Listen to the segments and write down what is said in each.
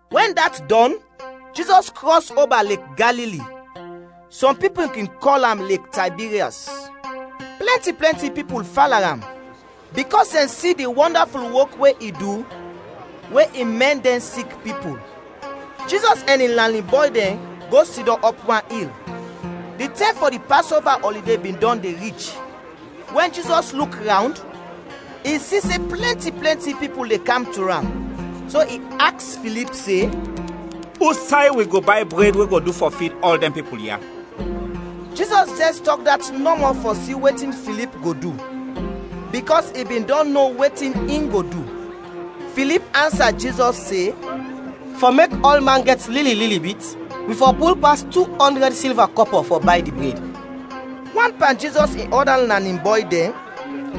Wɛn dat dɔn, Jizɔs krɔs oba Lek Galili (sɔm pipul kin kɔl am Lek Taybiryɔs). Plɛnti plɛnti pipul fala am, bikɔs dɛn si di wɔndaful wok we i du we i mɛn dɛn sik pipul. Jizɔs ɛn in lanin bɔy dɛn go sidɔm ɔp wan il. Di tɛm fɔ di Pasova ɔlide bin dɔn de rich. Wɛn Jizɔs luk rawnd, i si se plɛnti plɛnti pipul de kam to am, so i aks Filip se, “Usay wi go bay bred we go du fɔ fid ɔl dɛn pipul ya?” Jizɔs jɛs tɔk dat nɔmɔ fɔ si wetin Filip go du, bikɔs i bin dɔn no wetin in go du. Filip ansa Jizɔs se, “Fɔ mek ɔlman gɛt lili lili bit, wi fɔ pul pas tu ɔndrɛd silva kɔpɔ fɔ bay di bred.” Wan pan Jizɔs in ɔda lanin bɔy dɛn,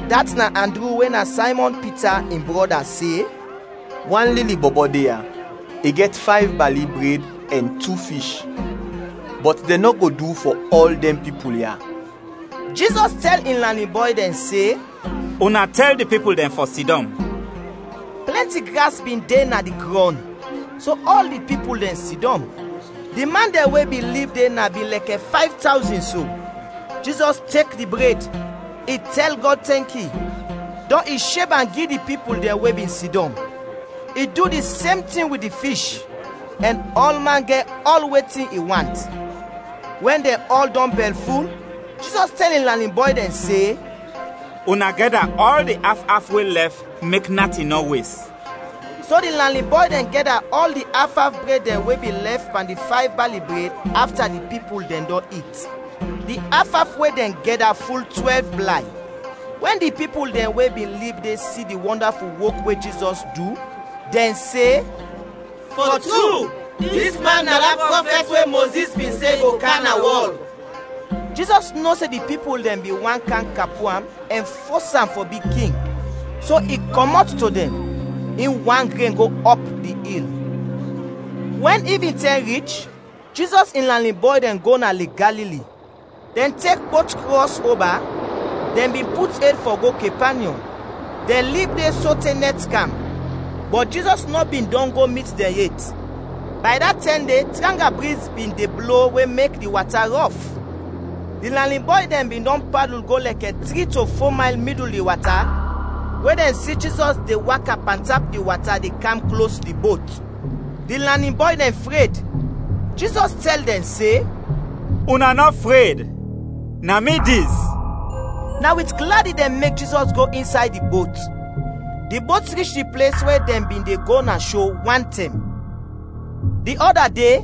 dat na Andru we na Saymɔn Pita in brɔda se, “Wan lili bɔbɔ de ya; i gɛt fayv bali bred ɛn tu fish. Bɔt dɛn nɔ go du fɔ ɔl dɛn pipul ya.” Jizɔs tɛl in lanin bɔy dɛn se, “Una tɛl di pipul dɛn fɔ sidɔm.” Plɛnti gras bin de na di grɔn, so ɔl di pipul dɛn sidɔm. Di man dɛn we bin lib de na bin lɛkɛ fayv tawzin so. Jizɔs tek di bred, i tɛl Gɔd tɛnki, dɔn i sheb am gi di pipul dɛn we bin sidɔm. I du di sem tin wit di fish, ɛn ɔlman gɛt ɔl wetin i want. Wɛn dɛn ɔl dɔn bɛlful, Jizɔs tɛl in lanin bɔy dɛn se, “Una gɛda ɔl di af af we lɛf, mek natin nɔ wes.” So di lanin bɔy dɛn gɛda ɔl di af af bred dɛn we bin lɛf pan di fayv bali bred, afta di pipul dɛn dɔn it. Di af af we dɛn gɛda ful twɛlv blay. Wɛn di pipul dɛn we bin lib de si di wɔndaful wok we Jizɔs du, dɛn se, “Fɔ tru, dis man na da prɔfɛt we Mozis bin se go kam na wɔl.” Jizɔs no se di pipul dɛn bin want kam kapu am ɛn fos am fɔ bi king, so i kɔmɔt to dɛn, in wan gren go ɔp di il. Wɛn ivintɛm rich, Jizɔs in lanin bɔy dɛn go na Lek Galili. Dɛn tek bot krɔs oba, dɛn bin put ed fɔ go Kepanyɔm. Dɛn lib de sote nɛt kam, bɔt Jizɔs nɔ bin dɔn go mit dɛn yet. Bay da tɛm de tranga briz bin de blo we mek di wata rɔf. Di lanin bɔy dɛn bin dɔn padul go lɛkɛ tri to fo mayl midul di wata we dɛn si Jizɔs de waka pantap di wata de kam klos di bot. Di lanin bɔy dɛn dɛn fred. Jizɔs tɛl dɛn se, “Una nɔ fred, na mi dis!” Na wit gladi dɛn mek Jizɔs go insay di bot, di bot rich di ples we dɛn bin de go na sho wantɛm. Di ɔda de,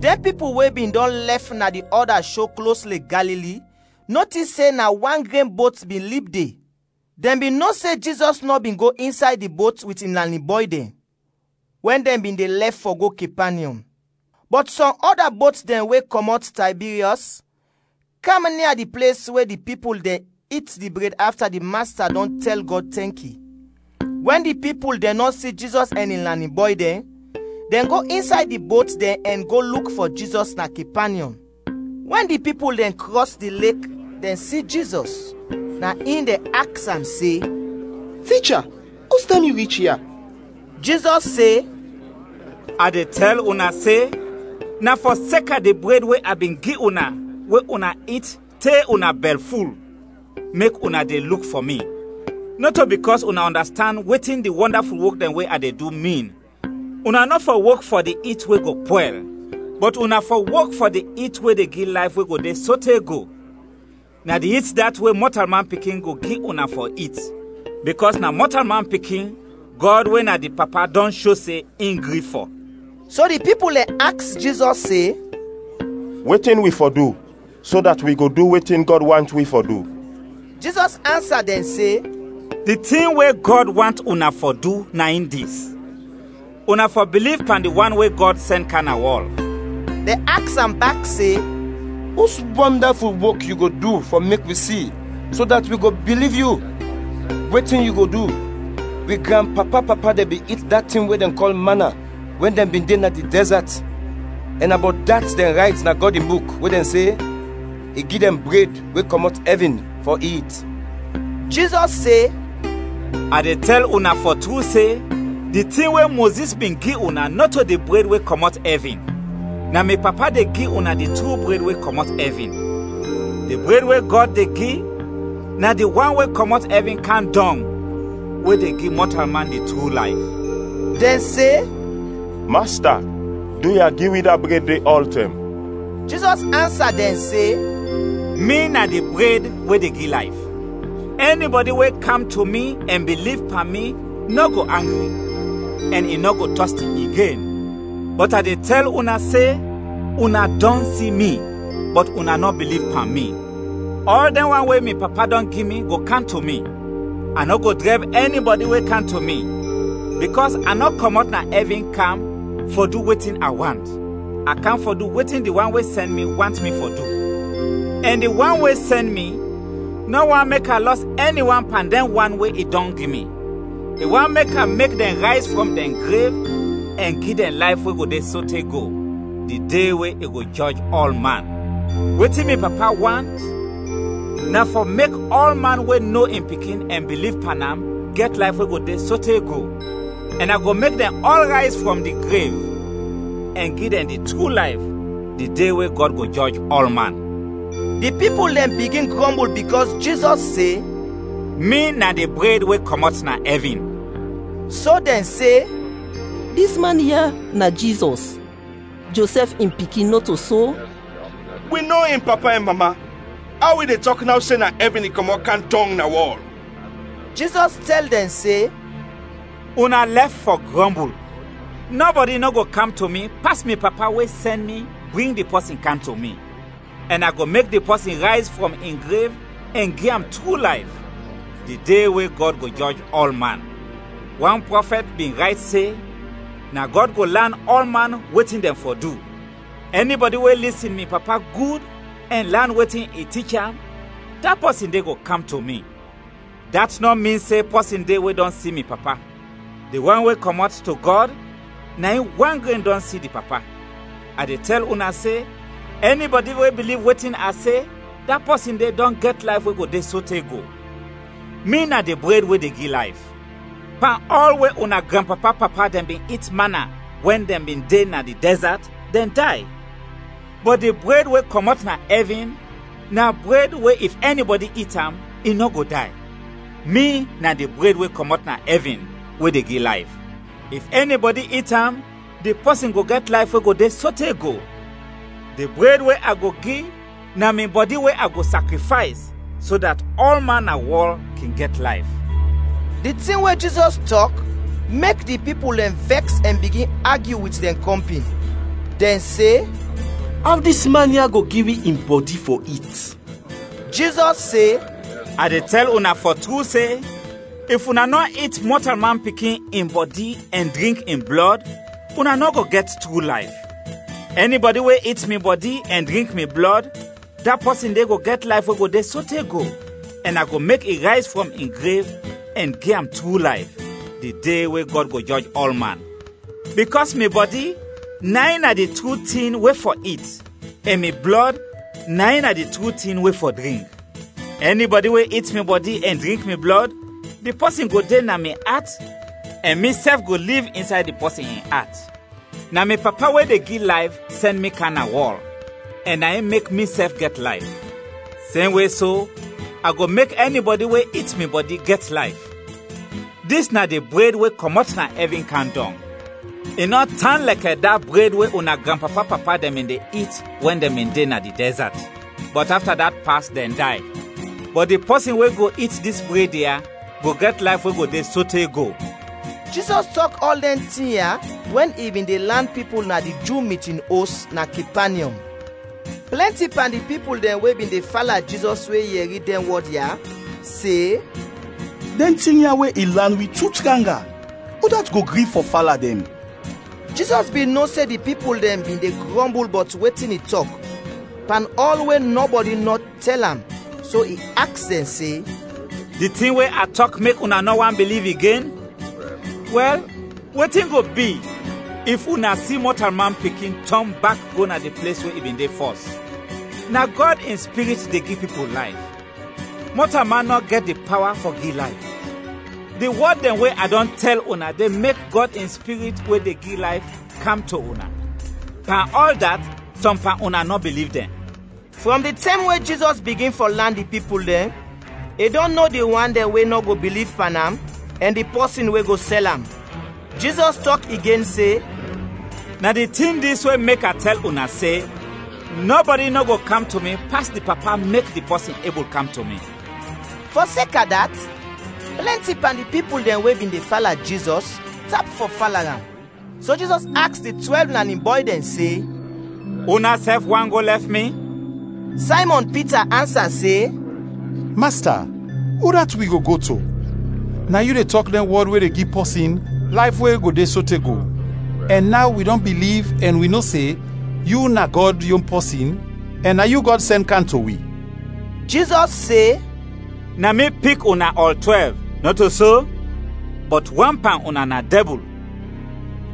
dɛn pipul we bin dɔn lɛf na di ɔda sho klos Lek Galili notis se na wan gren bot bin lib de. Dɛn bin no se Jizɔs nɔ bin go insay di bot wit in lanin bɔy dɛn, wɛn dɛn bin de lɛf fɔ go Kepanyɔm. Bɔt sɔm ɔda bot dɛn we kɔmɔt Taybiryɔs, kam nia di ples we di pipul dɛn it di bred afta di Masta dɔn tɛl Gɔd tɛnki. Wɛn di pipul dɛn nɔ si Jizɔs ɛn in lanin bɔy dɛn, dɛn go insay di bot dɛn ɛn go luk fɔ Jizɔs na Kepanyɔm. Wɛn di pipul dɛn krɔs di Lek dɛn si Jizɔs, na in dɛn aks am se, “Ticha, ustɛm yu rich ya?” Jizɔs se, “A de tɛl una se, na fɔseka di bred we a bin gi una we una it te una bɛlful, mek una de luk fɔ mi, nɔto bikɔs una ɔndastand wetin di wɔndaful wok dɛn we a de du, min. Una nɔ fɔ wok fɔ di it we go pwɛl, bɔt una fɔ wok fɔ di it we de gi layf we go de sote go. Na di it dat we Mɔtalman Pikin go gi una fɔ it, bikɔs na Mɔtalman Pikin, Gɔd we na di Papa dɔn sho se in gri fɔ.” So di pipul dɛn aks Jizɔs se, “Wetin wi fɔ du, so dat wi go du wetin Gɔd want wi fɔ du?” Jizɔs ansa dɛn se, “Di tin we Gɔd want una fɔ du na in dis: una fɔ biliv pan di wan we Gɔd sɛn kam na wɔl.” Dɛn aks am bak se, “Us wɔndaful wok yu go du fɔ mek wi si, so dat wi go biliv Yu? Wetin yu go du? Wi granpapa-papa dɛn bin it da tin we dɛn kɔl mana wɛn dɛn bin de na di dɛzat, ɛn na bɔt dat dɛn rayt na Gɔd in Buk we dɛn se, ‘I gi dɛn bred we kɔmɔt ɛvin fɔ it.’” Jizɔs se, “A de tɛl una fɔ tru se, di tin we Mozis bin gi una nɔto di bred we kɔmɔt ɛvin; na mi Papa de gi una di tru bred we kɔmɔt ɛvin. Di bred we Gɔd de gi na di wan we kɔmɔt ɛvin kam dɔng we de gi mɔtalman di tru layf.” Dɛn se, “Masta, duya, gi wi da bred de ɔltɛm.” Jizɔs ansa dɛn se, “Mi na di bred we de gi layf, ɛnibɔdi we kam to mi ɛn biliv pan mi nɔ go angri, ɛn i nɔ go tɔsti igen. Bɔt a de tɛl una se una dɔn si mi, bɔt una nɔ biliv pan mi. Ɔl dɛn wan we mi Papa dɔn gi mi go kam to mi. A nɔ go drɛb ɛnibɔdi we kam to mi, bikɔs a nɔ kɔmɔt na ɛvin kam fɔ du wetin a want, a kam fɔ du wetin di wan we sɛn mi want mi fɔ du. Ɛn di wan we sɛn mi nɔ want mek a lɔs ɛni wan pan dɛn wan we i dɔn gi mi, i want mek a mek dɛn rayz frɔm dɛn grev ɛn gi dɛn layf we go de sote go, di de we i go jɔj ɔlman. Wetin mi Papa want, na fɔ mek ɔlman we no in Pikin ɛn biliv pan am gɛt layf we go de sote go. Ɛn a go mek dɛn ɔl rayz frɔm di grev ɛn gi dɛn di tru layf, di de we Gɔd go jɔj ɔlman.” Di pipul dɛn bigin grɔmbul bikɔs Jizɔs se, “Mi na di bred we kɔmɔt na ɛvin.” So dɛn se, “Dis man ya na Jizɔs, Josɛf in pikin, nɔto so? Wi no in papa ɛn mama. Aw i de tɔk naw se na ɛvin in kɔmɔt kam dɔng na wɔl?” Jizɔs tɛl dɛn se, “Una lɛf fɔ grɔmbul! Nɔbɔdi nɔ go kam to mi pas mi Papa we sɛn mi bring di pɔsin kam to mi; ɛn a go mek di pɔsin rayz frɔm in grev ɛn gi am tru layf, di de we Gɔd go jɔj ɔlman. Wan prɔfɛt bin rayt se, ‘Na Gɔd go lan ɔlman wetin dɛn fɔ du.’ Ɛnibɔdi we lisin mi Papa gud ɛn lan wetin i tich am, da pɔsin de go kam to mi. Dat nɔ min se pɔsin de we dɔn si mi Papa; di wan we kɔmɔt to Gɔd, na in wan gren dɔn si di Papa. A de tɛl una se, ɛnibɔdi we biliv wetin a se, da pɔsin de dɔn gɛt layf we go de sote go. Mi na di bred we de gi layf. Pan ɔl we una granpapa-papa dɛn bin it mana wɛn dɛn bin de na di dɛzat, dɛn day. Bɔt di bred we kɔmɔt na ɛvin, na bred we if ɛnibɔdi it am, i nɔ go day. Mi na di bred we kɔmɔt na ɛvin we de gi layf, if ɛnibɔdi it am, di pɔsin go gɛt layf we go de sote go. Di bred we a go gi na mi bɔdi we a go sakrifays, so dat ɔlman na wɔl kin gɛt layf.” Di tin we Jizɔs tɔk, mek di pipul dɛn vɛks ɛn bigin agyu wit dɛn kɔmpin. Dɛn se, “Aw dis man ya go gi wi in bɔdi fɔ it?” Jizɔs se, “A de tɛl una fɔ tru se, if una nɔ it Mɔtalman Pikin in bɔdi ɛn drink in blɔd, una nɔ go gɛt tru layf. Ɛnibɔdi we it mi bɔdi ɛn drink mi blɔd, da pɔsin de go gɛt layf we go de sote go, ɛn a go mek i rayz frɔm in grev ɛn gi am tru layf, di de we Gɔd go jɔj ɔlman. Bikɔs mi bɔdi na in na di tru tin we fɔ it ɛn mi blɔd na di tru tin we fɔ drink. Ɛnibɔdi we it mi bɔdi ɛn drink mi blɔd, di pɔsin go de na mi at ɛn misɛf go liv insay di pɔsin in at. Na mi Papa we de gi layf sɛn mi kam na wɔl, ɛn na in mek misɛf gɛt layf. Semwe so, a go mek ɛnibɔdi we it mi bɔdi, gɛt layf. Dis na di bred we kɔmɔt na ɛvin kam dɔng, i nɔ tan lɛkɛ da bred we una granpapa-papa dɛn bin de it wɛn dɛn bin de na di dɛzat, bɔt afta dat pas dɛn day. Bɔt di pɔsin we go it dis bred ya go gɛt layf we go de sote go.” Jizɔs tɔk ɔl dɛn tin ya wɛn i bin de lan pipul na di Ju mitin os na Kepanyɔm. Plɛnti pan di pipul dɛn we bin de fala Jizɔs we yɛri dɛn wɔd ya, se, “Dɛn tin ya we i lan wi tu tranga. Udat go gri fɔ fala dɛn?” Jizɔs bin no se di pipul dɛn bin de grɔmbul bɔt wetin i tɔk, pan ɔl we nɔbɔdi nɔ tɛl am, so i aks dɛn se, “Di tin we a tɔk mek una nɔ want biliv igen? Wɛl, wetin go bi if una si Mɔtalman Pikin tɔn bak go na di ples we i bin de fɔs? Na Gɔd in Spirit de gi pipul layf. Mɔtalman nɔ gɛt di pawa fɔ gi layf. Di wɔd dɛn we a dɔn tɛl una de mek Gɔd in Spirit we de gi layf kam to una. Pan ɔl dat, sɔm pan una nɔ biliv dɛn.” (Frɔm di tɛm we Jizɔs bigin fɔ lan di pipul dɛn, i dɔn no di wan dɛn we nɔ go biliv pan am, ɛn di pɔsin we go sɛl am.) Jizɔs tɔk igen se, “Na di tin dis we mek a tɛl una se, nɔbɔdi nɔ go kam to mi pas di Papa mek di pɔsin ebul kam to mi.” Fɔseka dat, plɛnti pan di pipul dɛn we bin de fala Jizɔs, tap fɔ fala am. So Jizɔs aks di twɛlv lanin bɔy dɛn se, “Unasɛf want go lɛf mi?” Saymɔn Pita ansa se, “Masta, udat wi go go to? Na yu de tɔk dɛn wɔd we de gi pɔsin layf we go de sote go. Ɛn naw wi dɔn biliv ɛn wi no se, yu na Gɔd yon pɔsin ɛn na yu Gɔd sɛn kam to wi.” Jizɔs se, “Na mi pik una ɔl twɛlv, nɔto so? Bɔt wan pan una na dɛbul!”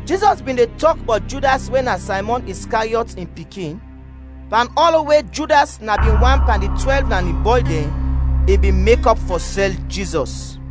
Jizɔs bin de tɔk bɔt Judas we na Saymɔn Iskariɔt in pikin, pan ɔl we Judas na bin wan pan di twɛlv lanin bɔy dɛn, i bin mekɔp fɔ sɛl Jizɔs.